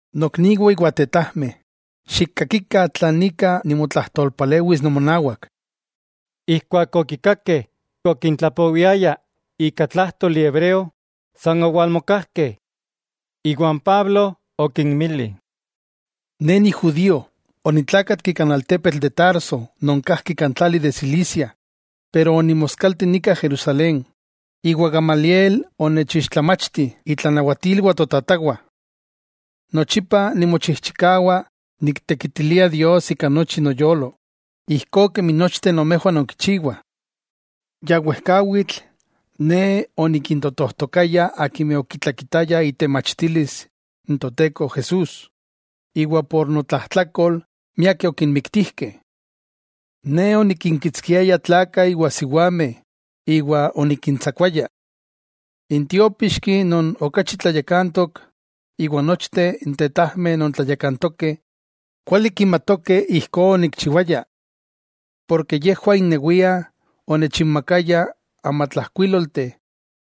—Nokniwah iwa tetajmeh, xikkakikah tlan ika nimotlajtolpalewis nomonawak. Ijkuak okikakeh okintlapowiaya ika tlájtoli hebreo, san owalmokajkeh. Iwa n Pablo okinmili: —Ne ni judío. Onitlákatki kan altepetl de Tarso non kajki kan tlali de Cilicia, pero onimoskalti nika Jerusalén, iwa Gamaliel onechixtlamachti itlanawatilwah totatawah. Nochipa nimochijchikawa niktekitilia Dios ika nochi noyolo, ijkó kemi nochteh nomejwah nonkichiwah. Ya wejkawitl, ne onikintotojtokaya akimeh okitlakitaya itemachtilis n Toteko Jesús, iwa por notlajtlakol miakeh okinmiktijkeh. Ne onikinkitskiaya tlakah iwa siwameh iwa onikintsakuaya. N tiópixki non okachi tlayakantok iwa nochteh n tetajmeh non tlayakantokeh kuali kimatokeh ijkó onikchiwaya. Porke yejwah innewiah onechinmakayah amatlajkuílolteh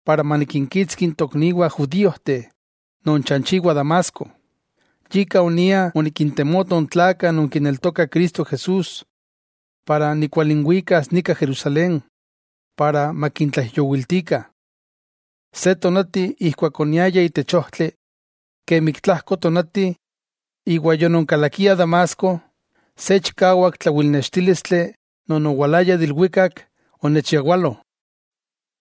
para manikinkitski n tokniwah judíojteh non chanchiwah Damasco. Yika onia onikintemoto n tlakah non kineltokah Cristo Jesús para nikualinwikas nika Jerusalén para makintlaijyowiltikah. 'Se tonati ijkuak oniaya itech ojtli, kemi ik tlajko tonati iwa yononkalakia Damasco, se chikawak tlawilnextílistli non owalaya de ilwikak onechyawalo.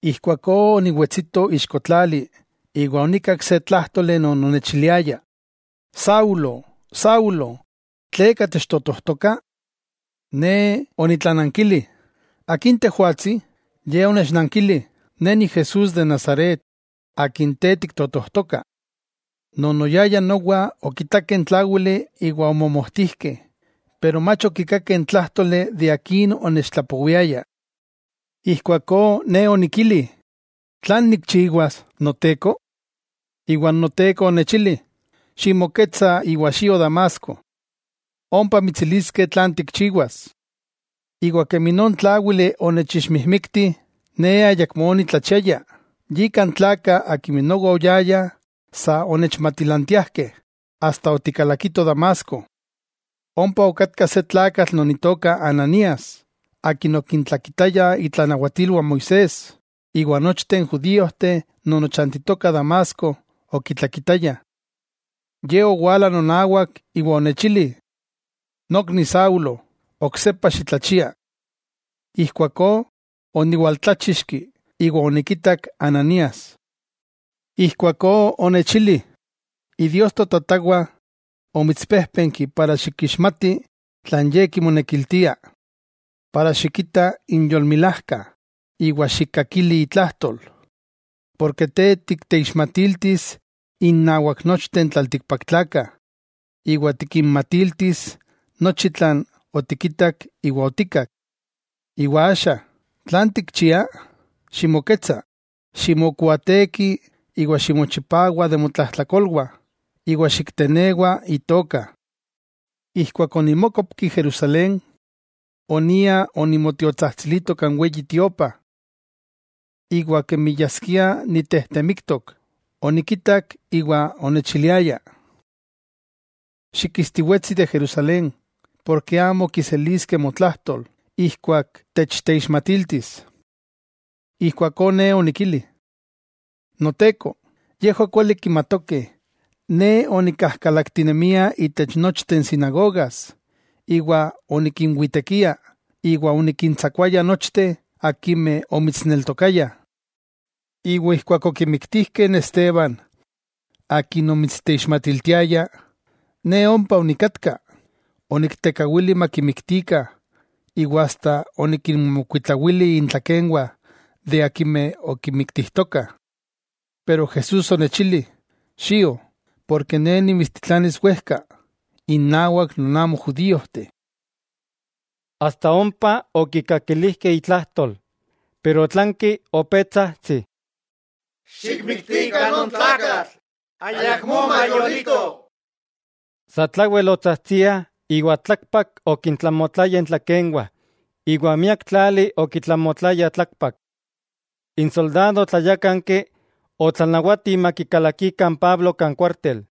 Ijkuakó oniwetsito ixko tlali iwa onikak se tlájtoli non onechiliaya: “Saulo, Saulo, ¿tleka techtotojtoka?” Ne onitlanankili: “¿Akin Tejwatsi?” Ye onechnankili: “Ne Jesús de Nazaret akin te tiktotojtoka.” Non oyayah nowa okitakeh n tláwili iwa omomojtijkeh, pero mach okikakeh n tlájtoli akin onechtlapowiaya. Ijkuakó ne onikili: “¿Tlan nikchiwas, Noteko?” Noteko onechili: “Ximoketsa iwa xio Damasco, ompa mitsiliskeh tlan tikchiwas.” Iwa kemi non tláwili onechixmijmikti, ne ayakmó onitlachiaya, yika n tlakah akimeh nowa oyayah sa onechmatilantiajkeh asta otikalakitoh Damasco. 'Ompa okatka se tlakatl non itoka Ananías, akin okintlakitaya itlanawatilwah Moisés, iwa nochteh n judíojteh non ochantitokah Damasco okitlakitayah. Ye owala nonawak iwa onechili: “Nokni Saulo, oksepa xitlachia.” Ijkuakó oniwaltláchixki, iwa onikitak Ananías. Ijkuakó onechili: “Idios totatawah omitspéjpenki para xikixmati tlan Ye kimonekiltia, para xikita n Yolmilajka iwa xikkakili itlajtol. Te tikteixmatiltis innawak nochteh n tlaltikpaktlakah iwa tikinmatiltis nochi tlan otikitak iwa otikkak. Iwa axa, ¿tlan tikchia? Ximoketsa, ximokuaateki iwa ximochipawa de motlajtlakolwah, iwa xiktenewa itoka.” 'Ijkuak onimókopki Jerusalén, onia onimotiotsajtsilito kan Weyi Tiopa, iwa kemi yaskia nitejtemiktok, onikitak iwa onechiliaya: “Xikistiwetsi de Jerusalén, porke amo kiseliskeh motlajtol ijkuak techteixmatiltis.” Ijkuakó ne onikili: “Noteko, yejwah kuali kimatokeh ne onikajkalaktinemia itech nochteh n sinagogas iwa onikinwitekia iwa onikintsakuamigya nochteh akimeh omitsneltokayah. Iwa ijkuak okimiktijkeh n Esteban akin omitsteixmatiltiaya, ne ompa onikatka, oniktekawili makimiktikah iwa asta onikinmokuitlawili intlakenwah akimeh okimiktijtokah.” Pero Jesús onechili: “Xio, porke Ne nimitstitlanis wejka, innawak non amo judíojteh.” Asta ompa okikakilijkeh itlajtol, otlanki opé tsajtsih: —¡Xikmiktikah non tlakatl! ¡Ayakmó mayolito! Satlawel otsajtsiah iwa tlakpak okintlamotlayah intlakenwah iwa miak tlali okitlamotlayah tlakpak. N soldado tlayákanki otlanawati makikalakikah n Pablo kan kuártel.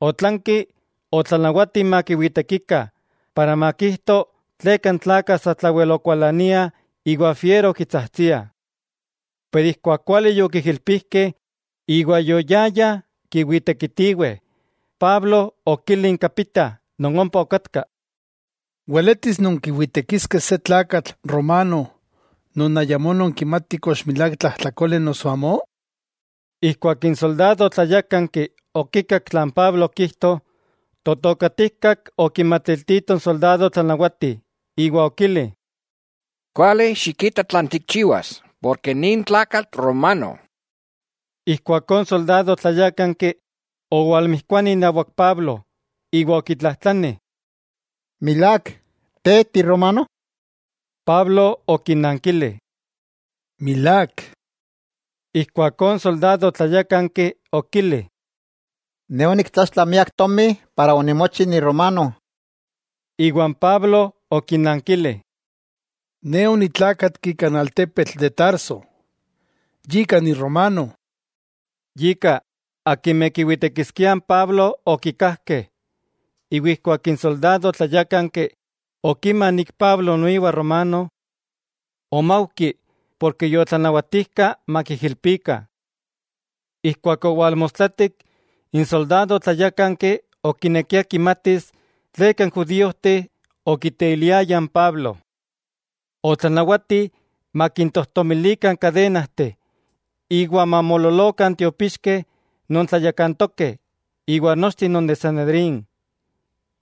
Otlanki otlanawati makiwitekikah para makijto tleka n tlakah satlawel okualaniah iwa fiero okitsajtsiah. Pero ijkuak kuali yokijilpijkeh iwa yoyayah kiwitekitiweh, Pablo okili n kapita non ompa okatka: —¿Weletis nonkiwitekiskeh se tlakatl romano non ayamó nonkimatih kox milák tlajtlakole noso amó? Ijkuak n soldado tlayákanki okikak tlan Pablo okijto, totokatijkak okimatiltito n soldado tlanawati iwa okili: —Kuali xikita tlan tikchiwas, nin tlakatl romano. Ijkuakó n soldado tlayákanki owalmijkuani inawak Pablo iwa okitlajtlani: —¿Milák te tiromano? Pablo okinankili: —Milák. Ijkuakó n soldadojtlayákanki okili: —Ne oniktlaxtla miak tomi para onimochi ni romano. Iwa n Pablo okinankili: —Ne onitlákatki kan altepetl de Tarso, yika ni romano. Yika, akimeh kiwitekiskiah n Pablo okikajkeh; iwa ijkuak n soldadojtlayákanki, okima Pablo noiwa romano, omaujki porke yotlanawatijka makiijilpikah. Ijkuak owalmostlatik, n soldado tlayákanki okinekia kimatis tleka n judíojteh okiteiliayah n Pablo. Otlanawati makintojtomilikah n kadenajteh iwa mamoololokah n tiopixkeh non tlayakantokeh iwa nochteh non de Sanedrín.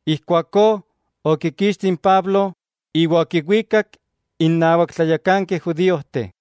Ijkuakó okikixti n Pablo iwa okiwikak innawak tlayakankeh judíojteh.